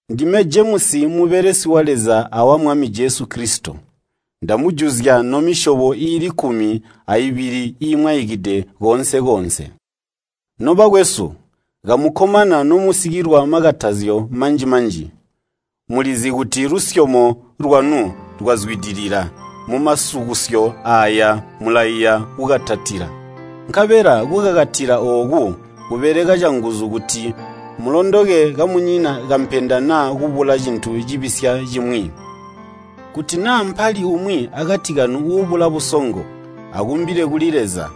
Ndime Jemusi mubelesi wa Leza awa Mwami Jesu Kilisito. Ndamujuzya nomisyobo iili kkumi aibili iimwaikide koonse-koonse. Nobakwesu, kamukkomana nomusikilwa makatazyo manji-manji. Mulizi kuti lusyomo lwanu lwazwidilila mumasukusyo aaya mulaiya kukakatila. Nkabela kukakatila ooku kubeleka canguzu kuti mulondoke kamunyina kampenda naa kubula cintu cibisya cimwi. Kuti naa mpali umwi akati kanu uubula busongo, akumbile kuli Leza,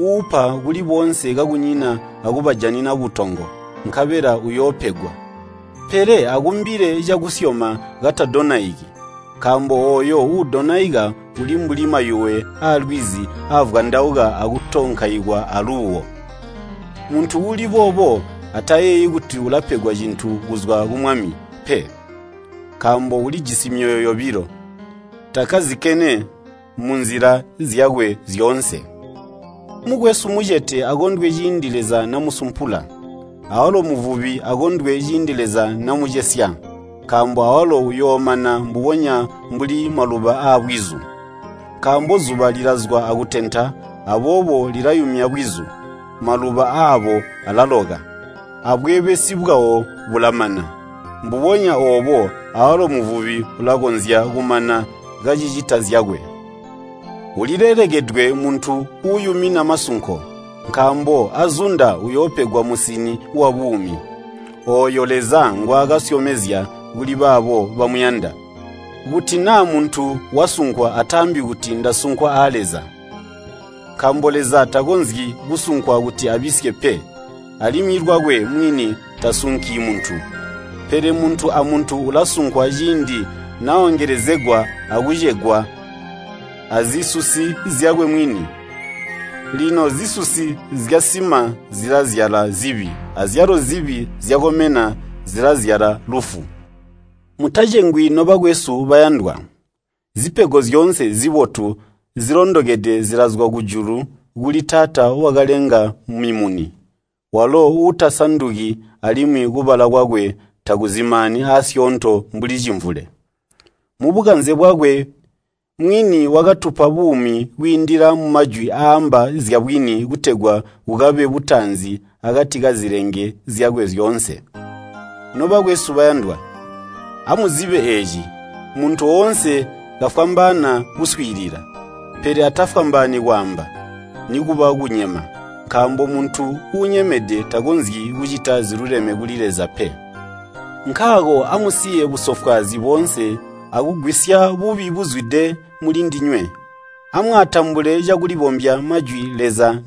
uupa kuli boonse kakunyina akubajanina butongo, nkabela uyoopegwa. Pele akumbile cakusyoma katadonaiki, nkaambo ooyo uudonaika uli mbuli mayuwe aalwizi aavwandauka akutonkaikwa aluuwo. Muntu uuli boobo atayeeyi kuti ulapegwa cintu kuzwa ku Mwami pe, nkaambo ulijisi myoyo yobilo, takkazikene munzila zyakwe zyoonse. Mukwesu mmucete akondwe ciindi Leza namusumpula, awalo muvubi akondwe ciindi Leza namucesya, nkaambo awalo uyoomana mbubonya mbuli maluba aabwizu. Nkaambo zuba lilazwa akutenta, aboobo lilayumya bwizu, maluba aabo alaloka, abweebesi bwawo bulamana. Mbubonya oobo awalo muvubi ulakonzya kumana kacicita zyakwe. Ulilelekedwe muntu uuyumina masunko, nkaambo azunda uyoopegwa musini wabuumi, ooyo Leza ngwaakasyomezya kuli baabo bamuyanda. Kuti naa muntu wasunkwa ataambi kuti, “Ndasunkwa a Leza.” Nkaambo Leza takonzyi kusunkwa kuti abisye pe, alimwi lwakwe mwini tasunki muntu. Pele muntu amuntu ulasunkwa ciindi naongelezegwa akucegwa azisusi zyakwe mwini. Lino zisusi zyasima zilazyala zibi, azyalo zibi zyakomena zilazyala lufu. Mutacengwi nobakwesu bayandwa. Zipego zyoonse zibotu, zilondokede zilazwa kujulu kuli Taata wakalenga mimuni, walo uutasanduki alimwi kubala kwakwe takuzimaani aasyoonto mbuli cimvule. Mubukanze bwakwe mwini wakatupa buumi kwiindila mumajwi aaamba zyabwini kutegwa kukabe butaanzi akati kazilenge zyakwe zyoonse. Nobakwesu bayandwa, amuzibe eeci, muntu woonse kafwambaana kuswiilila, pele atafwambaani kwaamba, nikuba kunyema. Nkaambo muntu uunyemede takonzyi kucita ziluleme kuli Leza pe. Nkaako amusiye busofwaazi boonse akugwisya bubi buzwide mulindinywe. Amwaatambule cakulibombya majwi Leza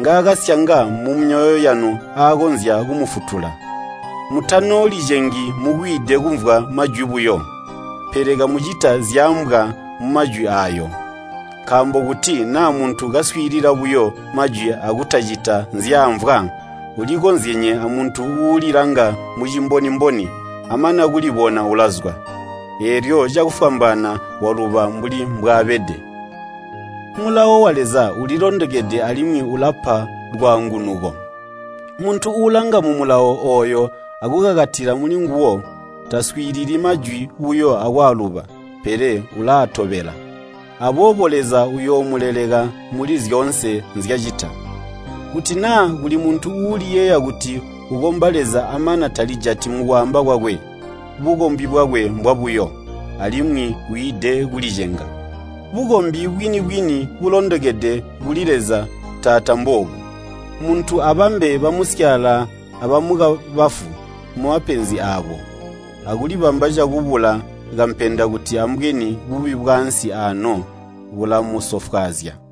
ngaakasyanga mumyoyo yanu aakonzya kumufutula. Mutanoolicengi mukwiide kumvwa majwi buyo, pele kamucita zyaambwa mumajwi aayo. Nkaambo kuti naa muntu kaswiilila buyo majwi akutacita nzyaamvwa, ulikozyenye amuntu uulilanga mucimboni-mboni, amana kulibona ulazwa, eelyo cakufwambaana waluba mbuli mbwaabede. Mulawo wa Leza ulilondokede alimwi ulapa lwaangunuko. Muntu uulanga mu Mulawo ooyo akukakatila mulinguwo, taswiilili majwi buyo akwaaluba, pele ulaatobela. Aboobo Leza uyoomuleleka muli zyoonse nzyacita. Kuti naa kuli muntu uuliyeeya kuti ukomba Leza amana talijati mukwaamba kwakwe, bukombi bwakwe mbwabuyo, alimwi wiide kulicenga. Bukombi bwini-bwini bulondokede kuli Leza Taata mboobu: muntu abambe bamusyaala abamukabafu mumapenzi aabo, akulibamba cakubula kampenda kuti ambweni bubi bwaansi ano bulamusofwaazya.